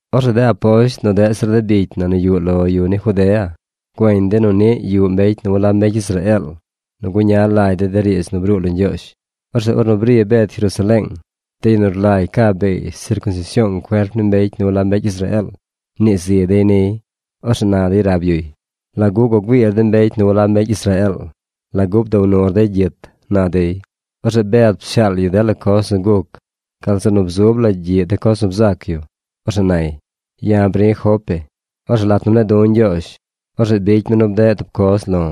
Orzeꞌ de aposht nu deꞌ zir bicy na nu yuꞌ lo yu ni Judea güeñ dey nu niꞌ yuꞌ mbecy nu walab mbecy Israeel nu guña lagy dey de riidz nu bruu lo Ñgyoozh. Orzeꞌ ornu bri Bed Jerusaleeng, de yu nu rlagy caa beey sircunsision cuerp ni mbecy nu walab mbecy Israeel mnii zi dey niy. Orzeꞌ na dey rab yuy: ―¿Lagu gua güiir de mbecy nu walab mbecy Israeel? ¿Lagu bdow nur dey gyit? ―na dey. Orzeꞌ Bed pshaal yu dela coz nu guc gal zeꞌ nu bzub la gyiꞌ de coz nu bzac yu. Orzeꞌ nay: ―Ya̱ bri̱ Jope. Orzeꞌ lat nu mne̱e̱ du̱ Ñgyoozh, orzeꞌ bicy mi nu bdeꞌ tub coz lo̱.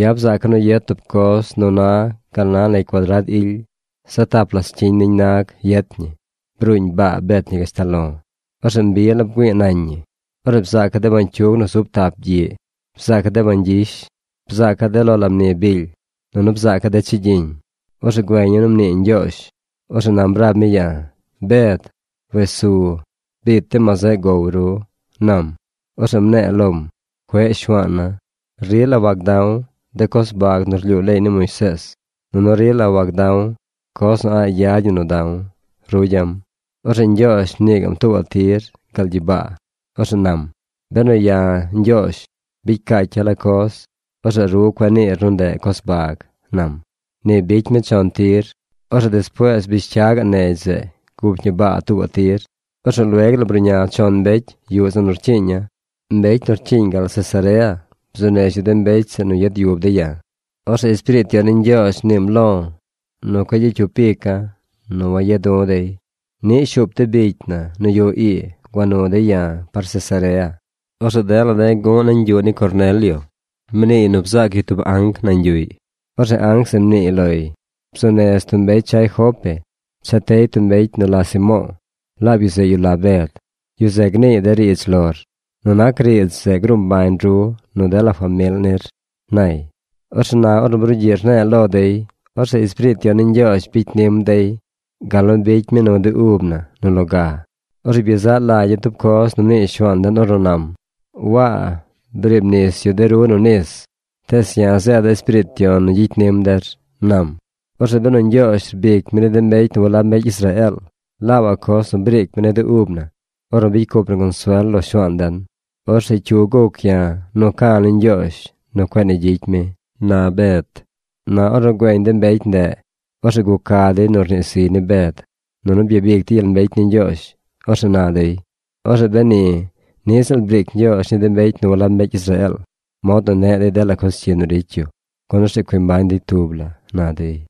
Ya̱ bzaaca̱ nu yet tub coz nu na gal na negy cuadrad ily. Zaꞌ tap la scyiñ niñ nag yet ñi. Bruuñ baa bet ñi gashtal lo̱. Orzeꞌ mbi la bgüi̱i̱ nañ ñi. Orzeꞌ bzaaca̱ de bañcyug nu zub tap gyiꞌ. Bzaaca̱ de bañ gyish. Bzaaca̱ de lo la mni bily. Nunu bzaaca̱ de chigyiñ. Orzeꞌ güeña̱ nu mnii Ñgyoozh. Orzeꞌ nam rab mi ya̱: “Bed, wes su. Biit de ma zeꞌ gow ru”, nam. Orzeꞌ Mne̱e̱ lom: “Cueꞌ Shuaana̱. Rila wagda̱w de coz bag nu rlyuu leey ni Moisees, nunu rila wagda̱w coz nu a̱ꞌ yad ñi nu da̱w”, rugya̱m. Orzeꞌ Ñgyoozh mnii gaꞌm tuubaꞌ tir gal gyibaa. Orzeꞌ nam: “Benu ya̱, Ñgyoozh, bicy caacya̱ la coz, orzeꞌ ru cueꞌ niir nu ndeꞌ coz bag”, nam. Ni bicy mi chon tir. Orzeꞌ despuees bish cya gaꞌ negy zeꞌ gup ñi baa tuubaꞌ tir. Orzeꞌ lueg la bruꞌña chon mbecy yuꞌ zeꞌ nu rcyiiña̱. Mbecy nu rcyiiñ gal Cesarea bzuu nez yu de mbecy zeꞌ nu yad yub dey ya̱. Orzeꞌ Espiriit Yon ni Ñgyoozh mniim lo̱ nu cueꞌ gyicy cyup ica̱ nu waya̱ du̱ dey. Niꞌ shuup de bicy na nu yuꞌ ii gua nu dey ya̱ par Cesarea. Orzeꞌ dela de̱ gu̱ꞌ nañ yuꞌ ni Cornelio. Mniiy nu bzaac yu tub anc nañ yuꞌy. Orzeꞌ anc zeꞌ mniiy loy: “Bzuu nez tub mbecy chay Jope cha tey tub mbecy nu la Simo̱o̱. Laab yu zeꞌ yu nu la Bed. Yu zeꞌ gniiy de riidz lor. Nu nac riidz zeꞌ gruu mbañ ru nu dela famil nir”, nay. Orzeꞌ na ornu brugyiꞌ rne̱e̱ lo dey, orzeꞌ Espiriit Yon ni Ñgyoozh bicy nim dey gal nu bicy mi nu de ub na nu loga. Orzeꞌ byezaꞌ lagya̱ tub coz nu mnii Shuaan den ornu nam: “Waa briib nis yu de ru nu nis, tees ya̱ zeeda̱ Espiriit Yon nu gyicy nim der”, nam. Orzeꞌ benu Ñgyoozh rbic mi ni de mbecy nu walab mbecy Israeel laabaꞌ coz nu briic mi ni de ub na ornu bicy cup na consuel lo Shuaan den, orzeꞌ ¿cyu guc ya̱ nu ca̱ ni Ñgyoozh nu cueꞌ ni gyicy mi? ―na Bed. Na ornu güeñ de mbecy ndeꞌ, orzeꞌ guca dey nu rnii ziy ni Bed, nunu byabic dey gyel mbecy ni Ñgyoozh. Orzeꞌ na dey: ―Orzeꞌ beni niꞌ ziꞌl briic Ñgyoozh ni de mbecy nu walab mbecy Israeel mod nu neꞌ dey dela coz cyi nu ricy yu gun orzeꞌ cui mbañ dey tub la ―na dey.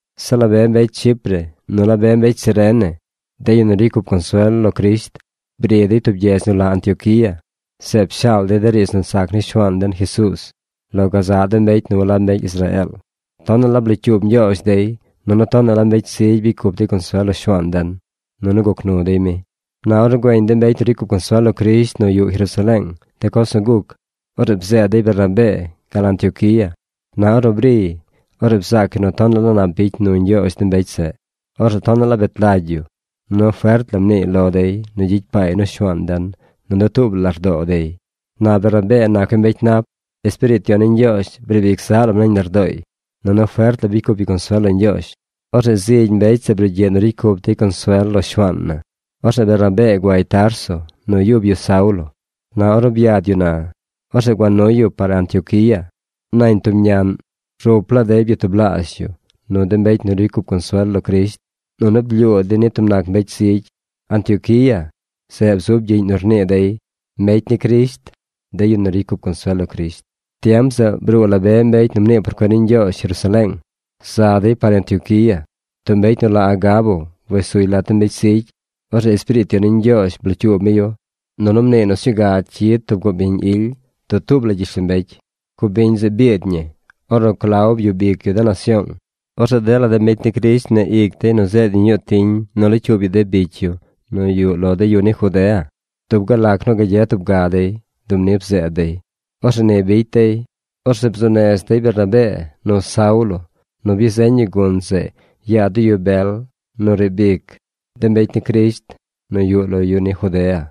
Zeꞌ la be mbecy Chipre, nu la be mbecy Cirene, de yu nu ricy cup consuel lo Crisht, bri dey tub gyedz nu la Antioquía. Zeꞌ pshaal dey de riidz nu sac ni Shuaan den Jesuuz lo gazaꞌ de mbecy nu walab mbecy Israeel. Tonaꞌ la blocyuub Ñgyoozh dey, nunu tonaꞌ la mbecy zigy bicy cup dey consuel lo Shuaan den, nunu guc nu dey mi. Na ornu güeñ de mbecy nu ricy cup consuel lo Crisht nu yuꞌ Jerusaleeng de coz nu guc, orzeꞌ bzeed dey Bernabee gal Antioquía. Na ornu briy, orzeꞌ bzaac yu nu tonaꞌ la nap bicy nu Ñgyoozh de mbecy zeꞌ. Orzeꞌ tonaꞌ la bet lagy yu, nunu fert la mniiy lo dey nu gyicy paay nu Shuaan den nu dutuub la lardoo dey. Na Bernabee nac yu mbecy nap. Espiriit Yon ni Ñgyoozh briib ic zaꞌ lam nañ lardooy. Nunu fert la bicy cup yu consuel lo Ñgyoozh. Orzeꞌ zigy mbecy zeꞌ brugyiꞌ nu ricy cup dey consuel lo Shuaan na. Orzeꞌ Bernabee guay Tarso nu yub yu Saulo. Na ornu byad yu na, orzeꞌ gua nuy yu par Antioquía. Nañ tub ñaꞌn rup laa dey byatublaazh yu nu de mbecy nu ricy cup consuel lo Crisht nunu blyuu dey ni tub nac mbecy zigy. Antioquía, zeꞌ bzub gyiꞌñ nu rnii dey “Mbecy ni Crisht” de yu nu ricy cup consuel lo Crisht. Tiem zeꞌ bruu la be mbecy nu mnii por cuen ni Ñgyoozh Jerusaleeng. Za dey par Antioquía. Tub mbecy nu la Agabo wes suy lat de mbecy zigy. Orzeꞌ Espiriit Yon ni Ñgyoozh blocyuub mi yu, nunu mniiy nu sñuu ga cyid tub cubiñ ily dutuub la gyishlombecy. Cubiñ zeꞌ biid ñi, ornu Clau byub ic yu de nasyoong. Orzeꞌ dela de mbecy ni Crisht mneꞌ ic dey nu zeed yu ñuu tiñ nu locyuub yu de bicy yu nu yuꞌ lo de yu ni Judea. Dub gal lac nu gagye tub ga dey, dub ni bzeed dey. Orzeꞌ ni bicy dey. Orzeꞌ bzuu nez dey Bernabee nu Saulo nu byazeñ yu gun zeꞌ yaa de yu bel nu riib ic de mbecy ni Crisht nu yuꞌ lo de yu ni Judea.